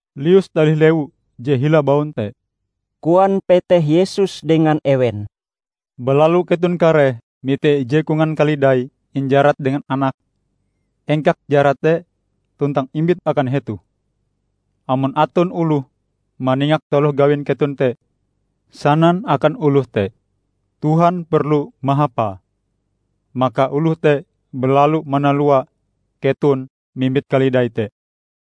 "Lius talih lewu je hila baun te," koan peteh Yesus dengan ewen. "Balalu keton kareh mite ije kongan kalidai injarat dengan anake. Engkak jarate tuntang imbit akan hetoh. Amon aton oloh maningak taloh gawin keton te, sanan akan oloh te, 'Tuhan perlu mahapae', maka oloh te balalu manalua keton mimbit kalidai te."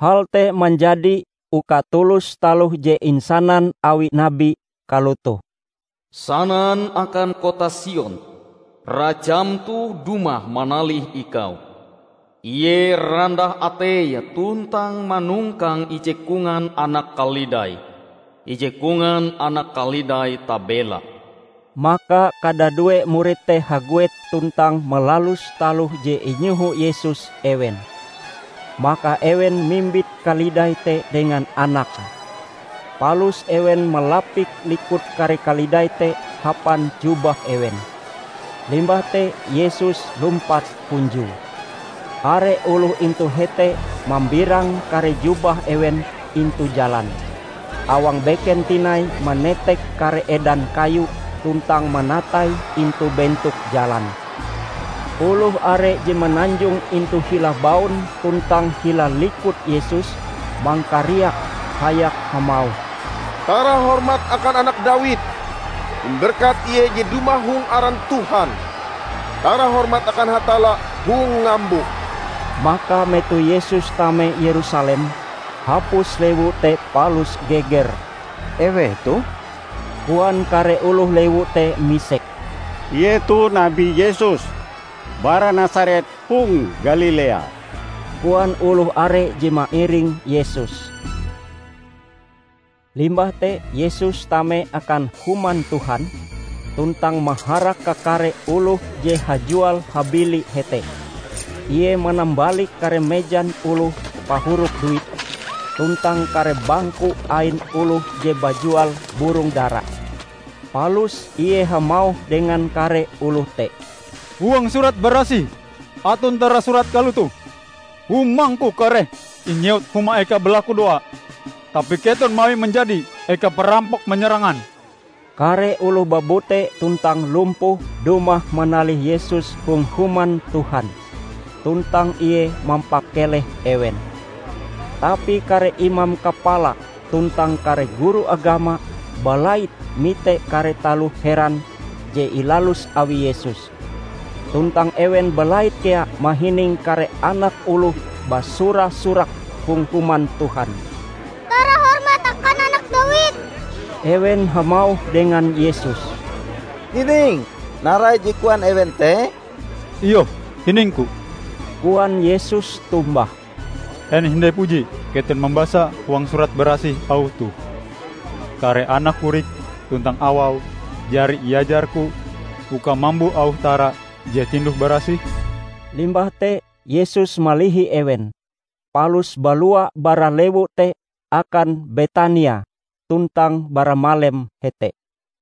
Hal te manjadi uka tulus taloh je insanan awi nabi kalotoh, "Sanan akan kota Sion, Rajam toh dumah manalih ikau. Ie randah ateie tuntang manongkang ije kongan anak kalidai, ije kongan anak kalidai tabela." Maka kadadue murid te haguet tuntang malalus taloh je inyoho Yesus ewen. Maka ewen mimbit kalidai te dengan anake. Palus ewen malapik likut kare kalidai te hapan jubah ewen. Limbah te Yesus lumpat hunjue. Are oloh intu hete mambirang kare jubah ewen intu jalan, awang beken tinai manetek kare edan kayu tuntang manataie intu bentok jalan. Oloh are je mananjong intu hila baun tuntang hila likut Yesus mangkariak hayak hamauh, "Tara hormat akan Anak Dawid! Imberkat Ie je dumah hong aran Tuhan! Tara hormat akan Hatalla hong ngambo!" Maka metoh Yesus tame Yerusalem, hapus lewu te palus geger. "Eweh toh?" koan kare oloh lewu te misek. "Ie toh Nabi Yesus, bara Nasaret hong Galilea," koan oloh are je mairing Yesus. Limbah te Yesus tame akan Human Tuhan, tuntang maharak kakare oloh je hajual-habili hete. Ie manambalik kare mejan oloh pahurup duit, tuntang kare bangku ain oloh je bajual burong dara. Palus Ie hamauh dengan kare oloh te, "Huang Surat Barasih aton tarasurat kalotoh, 'Humang-Ku kareh inyewut huma eka balakudoa.' Tapi keton mawie manjadi eka parampok manyarangan." Kare oloh babute tuntang lumpuh dumah manalih Yesus hong Human Tuhan, tuntang Ie mampakeleh ewen. Tapi kare imam kapala tuntang kare guru agama balait mite kare taloh heran je ilalus awi Yesus. Tuntang ewen balait kea mahining kare anak oloh basura-surak hong Human Tuhan, "Tara hormat akan Anak Dawid!" Ewen hamauh dengan Yesus, "Hiningm narai je koan ewen te?" "Iyoh, hining-Ku," koan Yesus tombah. "En hindai puji keton mambasa huang Surat Barasih auh toh: 'Kare anak korik tuntang awau jari iajar-Ku uka mambo auh tara je tinduh barasih'?" Limbah te Yesus malihi ewen, palus balua bara lewu te akan Betania tuntang baramalem hete.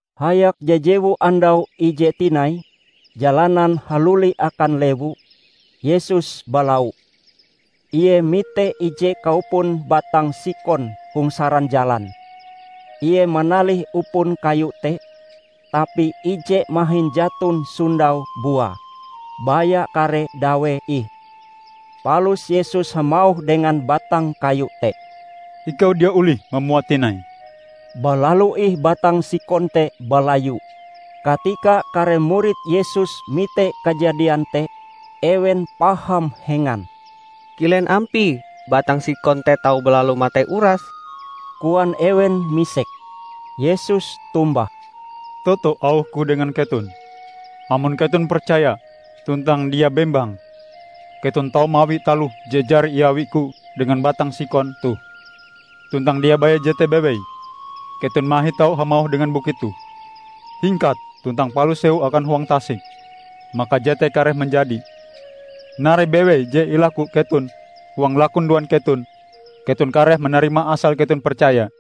Hayak jajewu andau ije tinai, jalanan haluli akan lewu, Yesus balau. Ie mite ije kaupon batang sikon hong saran jalan. Ie manalih upon kayu te, tapi ije mahin jaton sondau buae, baya kare dawee ih. Palus Yesus hamauh dengan batang kayu te, "Ikau dia olih mamua tinai!" Balalu ih batang sikon te balayu. Katika kare murid Yesus mite kajadian te, ewen paham hengan. "Kilen ampie batang sikon te tau balalu matei urase?" koan ewen misek. Yesus tombah, "Toto auh-Ku dengan keton. Amon keton percaya tuntang dia bembang, keton tau mawi taloh je jari iawi-Ku dengan batang sikon toh. Tuntang dia baya jete bewei, keton mahin tau hamauh dengan bukit toh, 'Hingkat tuntang palus sewu akan huang tasik'; maka jete kareh manjadi. Narai bewei je ilaku keton huang lakudoan keton, keton kareh manarimae asal keton percaya."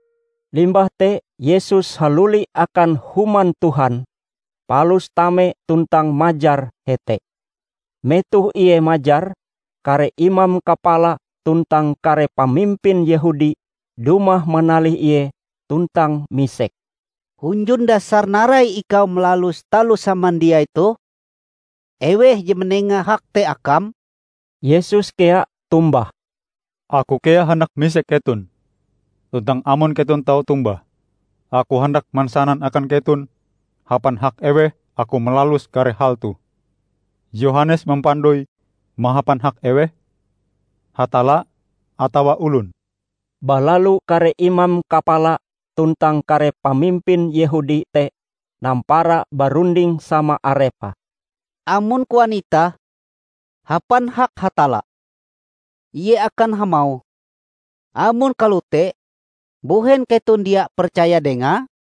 Limbah te Yesus haluli akan Human Tuhan, palus tame tuntang majar hete. Metoh Ie majar, kare imam kapala tuntang kare pamimpin Yehudi dumah manalih Ie tuntang misek, "Hunjun dasar narai ikau malalus taloh samandiai toh? Eweh je manenga hak te akam?" Yesus kea tombah, "Aku kea handak misek keton. Tuntang amon keton tau tombah, Aku handak mansanan akan keton hapan hak eweh Aku malalus kare hal toh. Yohanes mampandoi mahapan hak eweh? Hatalla atawa olon?" Balalu kare imam kapala tuntang kare pamimpin Yehudi te nampara barunding sama arepe, "Amon koan itah, 'Hapan hak Hatalla,' Ie akan hamauh, 'Amon kalote mbuhen keton dia percaya dengae?'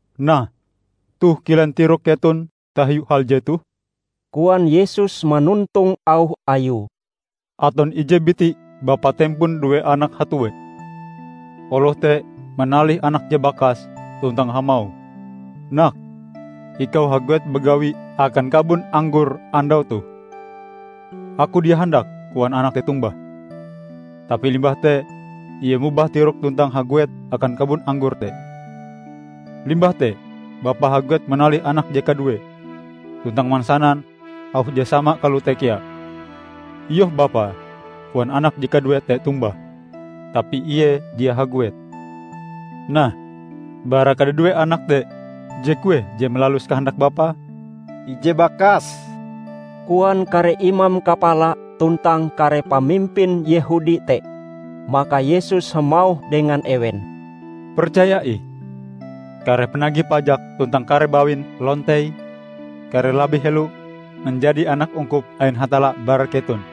"Nah, toh kilen tirok keton tahiu hal jetoh?" koan Yesus manontong auh Ayue. "Aton ije biti bapa tempon due anak hatue. Oloh te manalih anake je bakas tuntang hamauh, 'Nak, ikau haguet bagawi akan kabon anggor andau toh.' 'Aku dia handak,' koan anak te tombah. Tapi limbah te ie mobah tiroke tuntang haguet akan kabon anggor te. Limbah te bapae haguet manalih anake je kaduee, tuntang mansanan auh je sama kalote kea. 'Iyoh, bapa,' koan anak je kaduee te tombah. Tapi ie dia haguet. Nah, bara kadadue anak te, je kueh je malalus kahandak bapae?" "Ije bakas," koan kare imam kapala tuntang kare pamimpin Yehudi te. Maka Yesus hamauh dengan ewen, "Percaya ih: kare panagih pajak tuntang kare bawin lontei kareh labih helo manjadi anak ungkup ain Hatalla bara keton.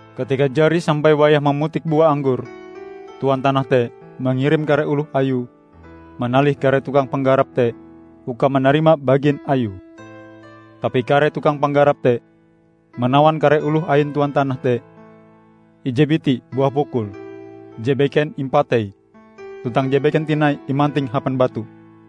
Katika jari sampai wayah mamutik bua anggor, tuan tanah te mangirim kare oloh ayue manalih kare tukang panggarap te uka manarima bagin ayue. Tapi kare tukang panggarap te manawan kare oloh ain tuan tanah te: Ije biti buah pukul, je beken impatei, tuntang je beken tinai imanting hapan batu.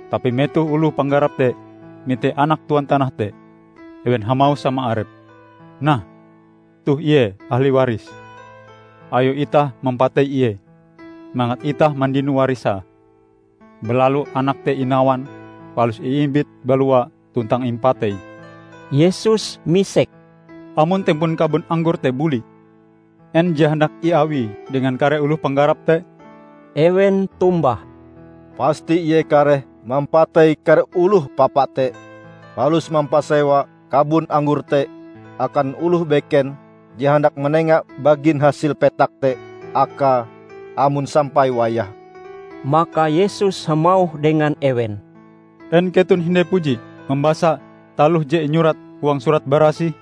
Tapi metoh oloh panggarap te mite anak tuan tanah te, ewen hamauh sama arepe, 'Nah, toh ie, ahli warise. Ayo itah mampatei ie, mangat itah mandino warisae!' Balalu anak te inawan palus iimbit balua tuntang impatei." Yesus misek, "Amon tempon kabon anggor te buli, en je handak iawie dengan kare oloh panggarap te?" Ewen tombah, "Pasti ie kareh mampatei kare oloh papa te, palus mampasewa kabon anggor te akan oloh beken je handak manenga bagin hasil petak te akae amon sampai wayahe." Maka Yesus hamauh dengan ewen, "En keton hindai puji mambasa taloh je inyurat huang Surat Barasih?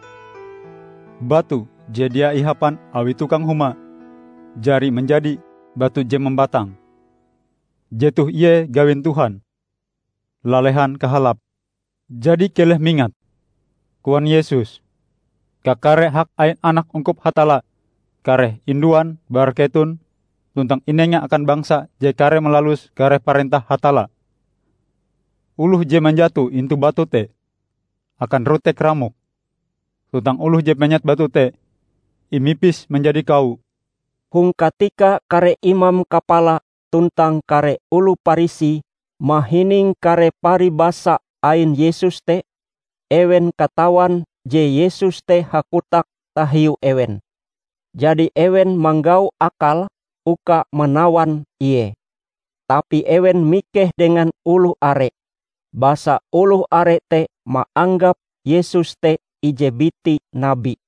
'Batu je dia ihapan awi tukang huma jari manjadi batu je mambatang. Jetoh ie gawin Tuhan; lalehan kahalape!' " "Jadi keleh mingat," koan Yesus, "kakare hak ain anak ungkup Hatalla kareh induan bara keton tuntang inenga akan bangsa je kareh malalus kare parentah Hatalla. [ Oloh je manjato intu batu te, akan rotek-ramok; tuntang oloh je penyet batu te, imipis manjadi kawo.]" Hong katika kare imam kapala tuntang kare oloh Parisi mahining kare paribasa ain Yesus te, ewen katawan je Yesus te hakotak tahiu ewen. Jadi ewen manggau akale uka manawan Ie. Tapi ewen mikeh dengan oloh are, basa oloh are te maanggap Yesus te ije biti nabi.